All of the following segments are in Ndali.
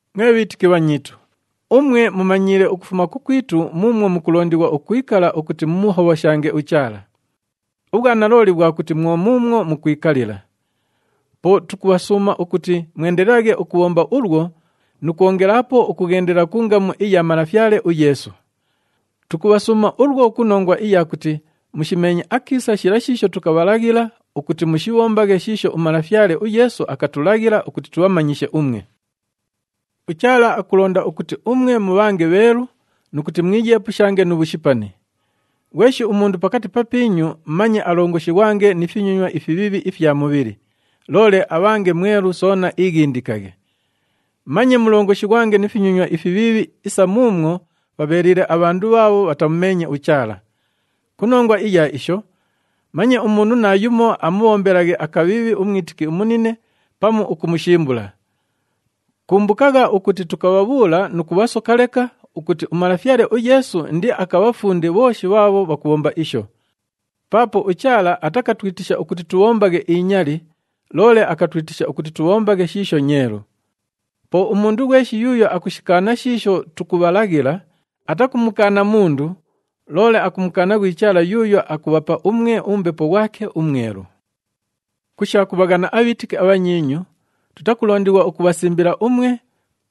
Mwe bhiitiki bhanyiitu, umwe mumanyiile ukufuma kukwitu muumwo mukulondighwa ukwikala ukuti mumuhobhoshange uChaala. Ubhwanalooli bhwa kuti mwo muumwo mukwikalila. Po tukubhasuuma ukuti mwendelelaghe ukubhomba ulwo nu kwongelaapo ukughendela ku ngamu iya Malafyale uYeesu. Tukubhasuuma ulwo ku nongwa iya kuti mushimeenye akiisa shila shiisho tukabhalaghila ukuti mushibhombaghe shiisho uMalafyale uYeesu akatulaghila ukuti tubhamanyishe umwe. UChaala akulonda ukuti umwe mubhange bheelu nu kuti mwiyeepushange nu bhushipani. Ghweshi umundu pakati papiinyu manye alongoshighwange ni finyonywa ifibhiibhi ifya mubhili, loole abhange mwelu soona iighindikaghe. Manye mulongoshighwange ni finyonywa ifibhiibhi isa muumwo bhabheeliile abhandu bhaabho bhatamumeenye uChaala. Ku nongwa iya isho, manye umundu naayumo amubhombelaghe akabhiibhi umwitiki umunine pamu ukumushimbula. Kumbukagha ukuti tukabhabhuula nu kubhasoka leka ukuti uMalafyale uYeesu indiakabhafunde bhooshi bhaabho bhakubhomba isho. Paapo uChaala atakatwitisha ukuti tubhombaghe inyali, loole akatwitisha ukuti tubhombaghe shiisho nyeelu. Po umundu ghweshi yuuyo akushikaana shiisho tukubhalaghila, atakumukaana mundu, loole akumukaana ghwi Chaala yuuyo akubhapa umwe uMbepo ghwake uMwelu. Ku sha kubhaghana abhiitiki abhanyiinyu, tutakulondighwa ukubhasimbila umwe,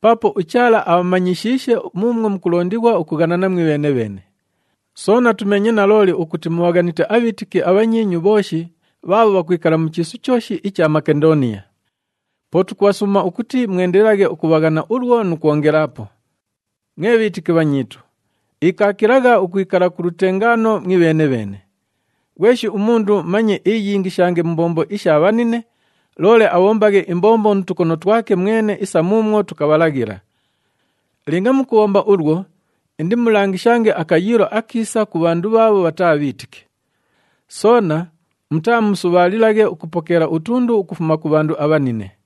paapo uChaala abhamanyishiishe muumwo mukulondighwa ukughanana mwibheene-bheene. Soona tumeenye nalooli ukuti mubhaghanite abhiitiki abhanyiinyu bhooshi bhaabho bhakwikala mu chiisu chooshi icha Makendooniya. Po tukubhasuuma ukuti mwendelelaghe ukubhaghana ulwo nu kwongelaapo. Mwe bhiitiki bhanyiitu, ikaakilagha ukwikala ku lutengaano mwibheene-bheene. Ghweshi umundu manye iiyingishange mu mbombo isha bhanine, loole abhombaghe imbombo nu tukono twake mwene isa muumwo tukabhalaghila. Linga mukubhomba ulwo, indimulangishange akayiilo akiisa ku bhandu bhaabho bhataa bhiitiki. Soona mutaamusubhaalilaghe ukupokeela utundu ukufuma ku bhandu abhanine.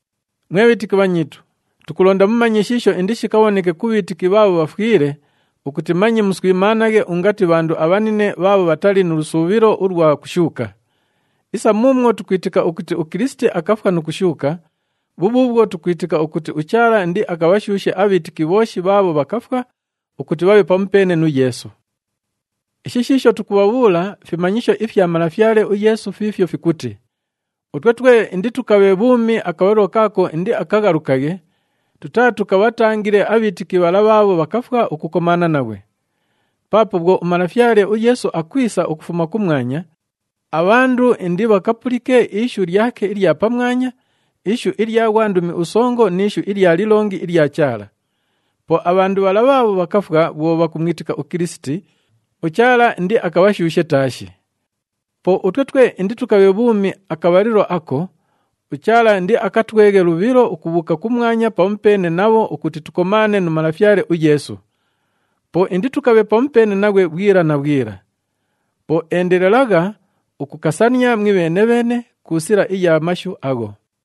Mwe bhiitiki bhanyiitu, tukulonda mumanye shiisho indishikabhoneke ku bhiitiki bhaabho bhafwile, ukuti manye muswimaanaghe ungati bhandu abhanine bhaabho bhatali nu lusuubhilo ulwa kushuuka. Isa muumwo tukwitika ukuti uKilisiti akafwa nu kushuuka, bhubhuubhwo tukwitika ukuti uChaala indiakabhashuushe abhiitiki bhooshi bhaabho bhakafwa ukuti bhabhe pamupeene nu Yeesu. Ishi shiisho tukubhabhuula fimanyisho ifya Malafyale uYeesu fiifyo fikuti, utwe twe inditukabhe bhuumi akabhalilo kaako indiakaghalukaghe, tutaatukabhatangile abhiitiki bhala bhaabho bhakafwa ukukomaana naghwe. Paapo bhwo uMalafyale uYeesu akwisa ukufuma kumwanya, abhandu indibhakapulike ishu lyake ilya pamwanya, ishu ilya ghwandumi usongo ni ishu ilya lilongi ilya Chaala. Po abhandu bhala bhaabho bhakafwa bhwo bhakumwitika uKilisiti, uChaala indiakabhashuushe taashi. Po utwe twe inditukabhe bhuumi akabhalilo ako, uChaala indiakatweghe lubhilo ukubhuuka kumwanya pamupeene nabho ukuti tukomaane nu Malafyale uYeesu. Po inditukabhe pamupeene naghwe bhwila na bhwila. Po endelelagha ukukasania mwibheene-bheene ku sila iya mashu agho.